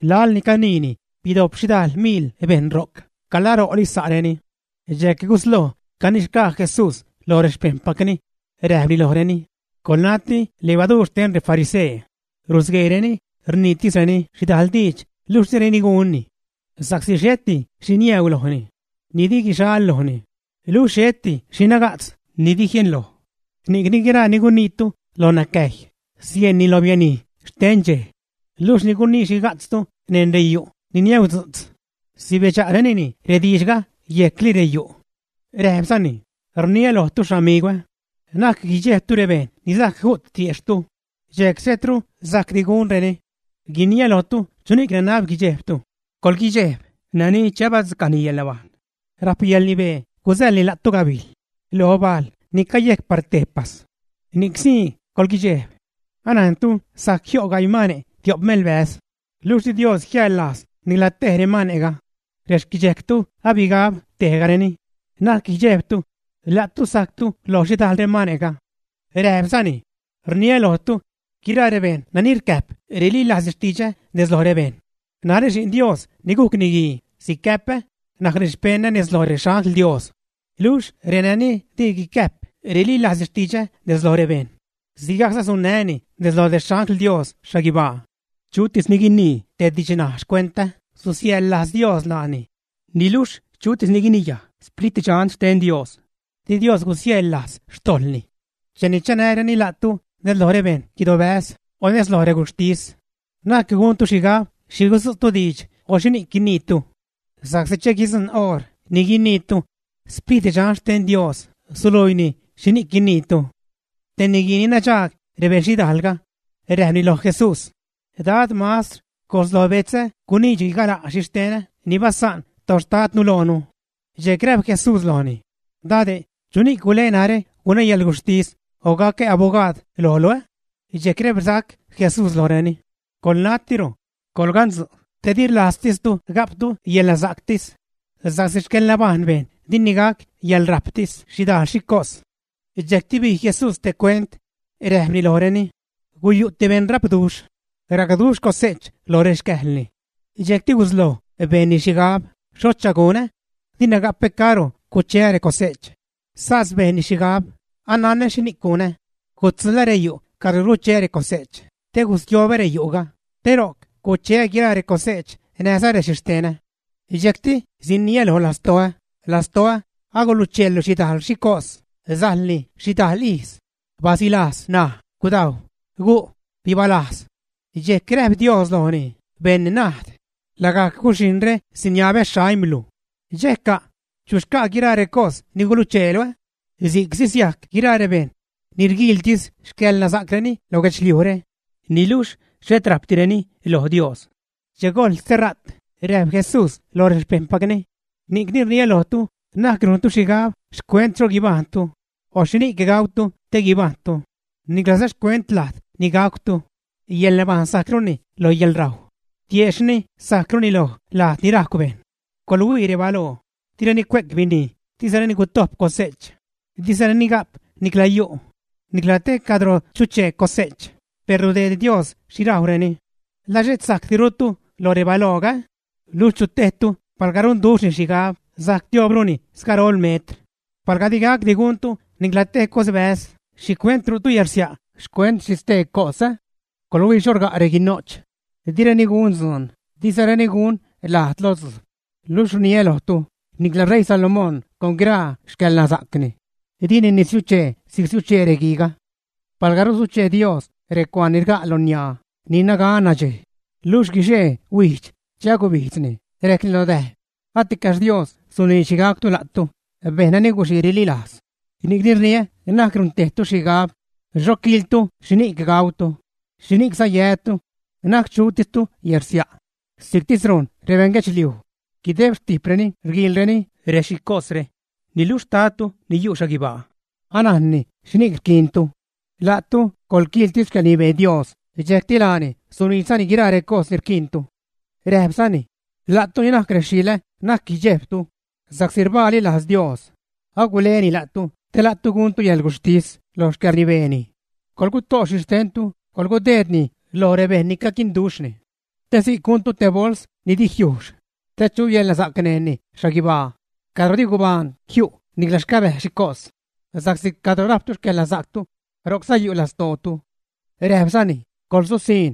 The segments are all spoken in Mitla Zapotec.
Laḻ ni caniini, bidojp xhidajl miḻ bejṉ ro'c, calaro'li sa'reni. Dxejc gusloj canixgaa Jesús loj rexpejṉpacni, räjpni lojreni: ―Coḻnati levaduur xten refarisee, rusgueereni rniitisreni xhidajl diidx luxh direni gunni. Sa'csi xheti xhi niäu lojni ni di guxal lojni luxh xheti xhi naga'tz ni di jienloj. Ni'cni guiraa ni guniitu lo nacäjy, sieṉni lo bianij xten dxej. Luxh ni gunii xhiga'tztu neṉ reyu' ni niäudzu'tz, sibedxa'renini rediidxga yejcli reyu'. Räjpzani: ―Rniä lojtu, xamigwä, na'c guidxejbtu rebejṉ ni sajc ju't tiejxhtu, dxejc xhetru sajcdi gunreni. Guiniä lojtu chuni'c nanab guidxejbtu. Coḻguidxejb nani che abadzucajni yäḻnabajṉ rajpni yäḻrnibee gusäḻni la'tu gabijl lo bajl ni cayejc par tejpas. Ni'csii coḻguidxejb. ’Anajntu sajc jio' gaii mane' tio'p melbäz, luxh di Dios jiäḻlajz nicla tej remane'ga. Rexquidxejctu abigab tebgajni. Na'c guidxejbtu; la'tu sajcrutu loj xhidajl remane'ga. Räjpzani: ―Rniä lojtu, guiraa rebejṉ nani rcäjp rililajzni xtidxä nez loj rebejṉ, narä Xi'n Dios ni gujc Niguii sicäpä najcni xpeṉä nez loj rexangl Dios. Luxh reni di guicäjp rililajzni xtidxä nez loj rebejṉ, sigajcza sunnää́ni nez loj rexangl Dios xhaguibaa. ’Chutis ni guinii te didxnaj xcuentä, susiäjḻlajz Dios laani. Niluxh chutis ni guiniyaj Sprit Dxan xten Dios, di Dios gusiäjḻlajz xtojḻni. ’Cheni chanäreni la'tu nez loj rebeṉ guidobäz o nez loj reguxhtis, na'c guntu xhigab xhi gudzu'tu diidx o xhini'c guiniitu, sa'csi che guidzujṉ oṟ ni guiniitu, Sprit Dxan xten Dios suluiini xhini'c guiniitu. Te niguii ni nadxaag rebejṉ xhidaalga räjpni loj Jesús: ―Dad, Mastr, gojs lo betzä guniidxni gala' xhixtenä ni basa'n toxtadnu loonu. Dxejc räjp Jesús lojni: ―Dade', ¿chuni'c gule narä gunä yäḻguxhtis o gacä abogaad lojlu, ä? Dxejc räjpsac Jesús lojreni: ―Coḻnatiro, coḻgantzu' te di rlajztistu ga'ptu yäḻnasa'ctis sa'csi xcäḻnabajṉ bejṉ dini gac yäḻrajptis xhidajl xhi cos. Dxejcti bij Jesús te cuent, räjpni lojreni: ―Guyu' te beṉ rapduxh. Racduxh cose'ch lo rexcäjlni. Dxejcti gusloj bejnni xhigab: “¿Xhocha gunä? Dina gapä cadro cucheä recose'ch.” Sas bejnni xhigab: “Ananä xhini'c gunä. Gudzuḻä reyu' cadro rgucheä recose'ch, te gustiobä reyu'ga, te ro'c cucheä guiraa recose'ch näjza rexhixtenä.” Dxejcti siniä lo lastoä: “Lastoä, agulucheelu xhidajl xhi cos, sajlni xhidajl ijz. Basilajz ṉaj, gudajw, gu', bibalajz.” Dxejc räjp Dios lojni: “¡Beṉ najd! Lagajc guxhijṉre siniabä xaimlu. ¿Dxejca'? ¿Chu xca' guiraa recos ni gulucheelu?” Si'c sisiajc guiraa rebejṉ ni rguiiltis xcäḻnasa'creni lo guedxliujre, niluxh xhet rajpdireni loj Dios. Che gojḻ stera't, räjp Jesús loj rexpejṉpacni: ―Ni'cni rniä lojtu, na'c rujntu xhigab xcuent xho guibajṉtu o xhini'c gautu te guibajṉtu, niclaza xcuent lajd ni gacwtu. Yäḻnabajṉ sajcruni lo yäḻrajw; tiejxhni sajcruni lo lajd ni rajcw bejṉ. ¡Coḻhuii rebaloo! Direni cue'c binij, dizareni gutojp cose'ch, dizareni ga'p nicla yu' nicla te cadro chuchee cose'ch, per rudeed Dios xhi rajwreni. ¿La xhet sajcdirutu loj rebalooga, ä? Luxh ¿Chu tejtu palga runduxhni xhigab sajc tioobruni sgarol metr? Palga di gacdi guntu nicla te cosbäz, ¿xhicuent ru'tu yärsia' xcuent xhi stee cos? ’¡Coḻhuii xho rga' reguino'ch! Direni gun dzuun, dizareni gun lajd lo dzujb, luxh rniä lojtu, nicla ṟeii Salomón con guiraa xcäḻnasa'cni, dini nisiuchee si'c rsiuchee reguiiga. Palga rusuchee Dios recuaan ni rga' lo niaa, ni rial nadxej, luxh guixee-huijdx, che agubijdzni, rejcni lo däj, aticaxh Dios suniidx xhi gacw la'tu, ¡bejṉ nani guxii rililajz! Ni'cni rniä na'c runtejtu xhigab xho quiiltu xhini'c gautu, xhini'cza yätu, na'c chutistu yärsia'. Si'ctis rujn rebeṉguedxliuj guideb xtijpreni rguiilreni rexhicosre. Niluxh xtadtu ni yu' xhaguibaa anajnni xhini'c rquiintu. La'tu coḻquiiltis xcäḻrnibee Dios, dxejcti laani suniidxzani guiraa recos ni rquiintu. Räjpzani: ―La'tu ni najc rexilä'ä, na'c guidxejbtu, sa'csi rbaali lajz Dios, aguleni la'tu te la'tu guntu yäḻguxhtis lo xcäḻrnibeeni. Coḻguto' xhixtentu, coḻgudeedni loj rebejṉ ni caquinduxhni, te si'c guntu te bols ni di jiujxh, te chu yäḻnasa'c neṉni xhaguibaa cadro di gubaan jiu' niclaza xcabäj rexhicos. Sa'csi cadro rajptu xcäḻnasa'ctu, ro'cza yu' lastootu. Räjpzani: ―¡Coḻsusiṉ!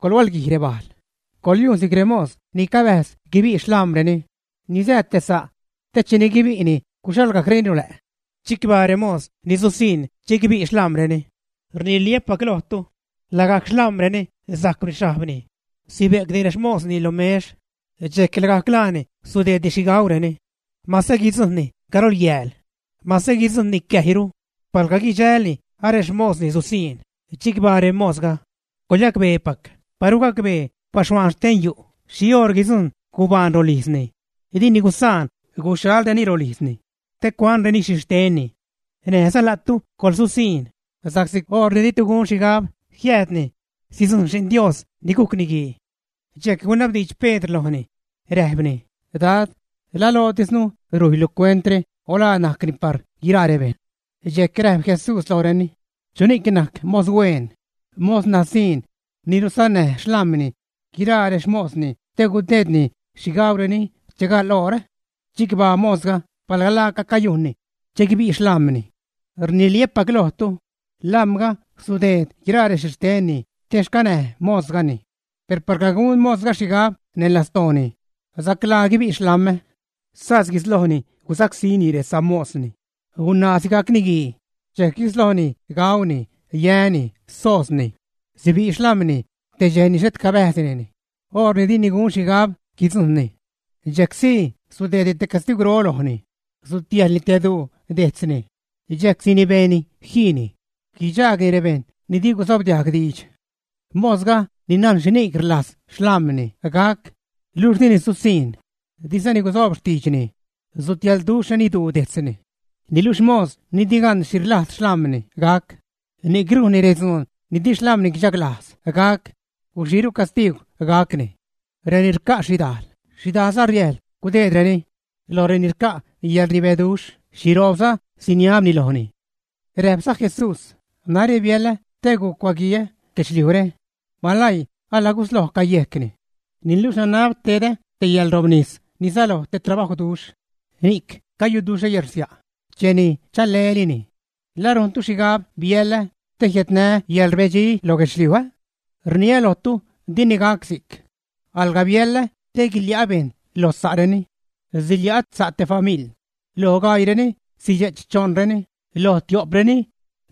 ¡Coḻhualguij rebajl! Coḻyujn si'c remos ni cabäjz guibi' xlam̲reni ni sää te sa', te cheni guibi'ni guxhalgajcreni rolä'. Chicbaa remos ni susiṉ che guibi' xlam̲reni. Rniliä́pac lojtu, lagajc xlam̲reni sajcwni xhajbni sibe'cni rexmosni lo mex, dxejc lagajc laani sudeedni xhi gaureni. Mase guidzujṉni garol yääl, mase guidzujṉni cäjyru, palga guidxälni arexmosni susiṉ, ¡chicbaa remosga! Coḻyacbeepac, paru gacbee baxhuaan xten yu' xhi oṟ guidzujṉ gubaan rolijzni, dini gusaan guxhalreni rolijzni te cuanreni xhixtenni. Näjza la'tu coḻsusiṉ, sa'csi oṟ ni ditu gun xhigab jiäädni, sidzujṉ Xi'n Dios ni gujc Niguii. Dxejc gunabdiidx Pedr lojni, räjpni: ―Dad, ¿la lootisnu rujylu cuentre o la najcni par guiraa rebejṉ? Dxejc räjp Jesús lojreni: ―¿Chuni'c najc mos hueen, mos nasiṉ, ni rusannäj xlam̲ni guiraa rexmosni te gudeedni xhi gaureni che gaḻ oor, ä? Chicbaa mosga palga laaca cayujnni che guibi' xlam̲ni. Rniliä́pac lojtu, lam̲ga sudeed guiraa rexhixtenni te xcanäj mosgani. Per palga gun mosga xhigab neṉ lastooni: “Saclaa guibi' xlam̲ä”, sas guislojni gusacsíni resamosni, gunaa sigajc niguii, dxejc guisloj gauni, yäni, soozni; sibi' xlam̲ni te dxej ni xhet cabäjzdinini, oṟ ni dini gun xhigab guidzujṉni. Dxejc sii sudeedni te castigwro lojni, sutiäjlni te duu dejtzni dxejc sinibeeni jiini, guidxaagni rebejṉ ni di gusobdiajg diidx. ’Mosga ni najn xhini'c rlajz xlam̲ni gac, luxh dini susiṉ, dizani guzoob xtiidxni, sutiälduxhreni duu dejtzni. Niluxh mos ni di gan xhi rlajz xlam̲ni gac, ni'c rujnni redzuun ni di xlam̲ni guidxaglajz gac, guxiiru castiigw gacni. Reni rca' xhidajl, xhidajlza riäjḻ gudeedreni; loj reni rca' yäḻrnibeduxh, xhiroobza siniabni lojni. Räjpza Jesús: ―Narä biälä te gucuaguiä guedxliujre; ¡malaii alagusloj cayejcni! Niluxh nanab tedä te yäḻrobnis ni säloj te trabajwduxh, ni'c cayuduxhä yärsia' cheni chale'lini. ¿La rujntu xhigab biälä te jiädnää́ yäḻrbedxi loj guedxliuj, ä? Rniä lojtu, dini gac si'c. Alga biäḻä te guilia'ä bejṉ lo sa'reni. Silia' sa' te famiḻ; loj gaiireni, sidxe'ch choṉreni loj tio'preni,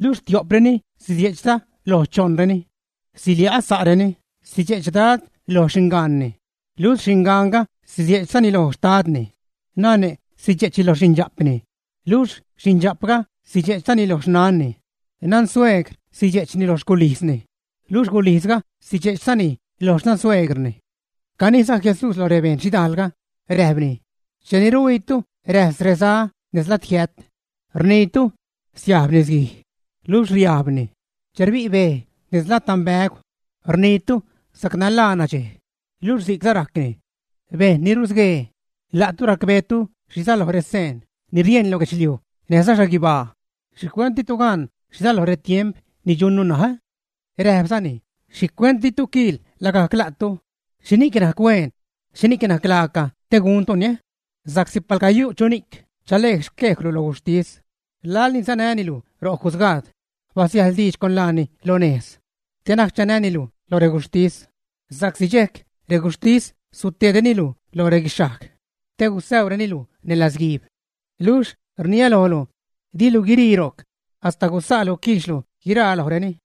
luxh tio'preni sidxe'chza lo choṉreni. Silia' sa'reni; sidxe'ch dad lo xingaanni, luxh xingaanga sidxe'chza lo xtadni; nane' sidxe'ch lo xindxa'pni, luxh xindxa'pga sidxe'chzani lo xnanni; nansuegr sidxe'chni lo xculijzni, luxh gulijzga sidxe'ch lo xnansuegrni. Caniiza Jesús lo rebeṉ xhidajlga, räjpni: ―Cheni rhuiitu räjs reza nez lad jiät, rniitu: “Siajb nisguij.” Luxh riajbni. Che rbi' bej nez lad danbägw, rniitu: “Sacnalaa nadxej”, luxh si'c rajcni. ¡Bejṉ ni rusguee! La'tu racbeetu xhi säloj reseen ni rieṉ lo guedxliuj näjza xhaguibaa, ¿xhicuent ditu gan xhi säloj retiemp ni dxunnu ṉaj, ä? Räjpzani: ―¿Xhicuent ditu quiil lagajc la'tu xhini'c najc hueen, xhini'c najc laaca te guntuni? Sa'csi palga yu' chuni'c chale'c xquejlu lo guxhtis, laḻni sanäni luj ro jusgaad, basiäjḻ diidx con laani lo nejz, te na'c chanäni luj lo reguxhtis, sa'csi dxejc reguxhtis suteedreni luj lo reguixhajg te gusäureni luj neṉ latzguiib. Luxh rniä lojlu, dilu guirii ro'c hasta gusa'lu quiixlu guiraa lojreni.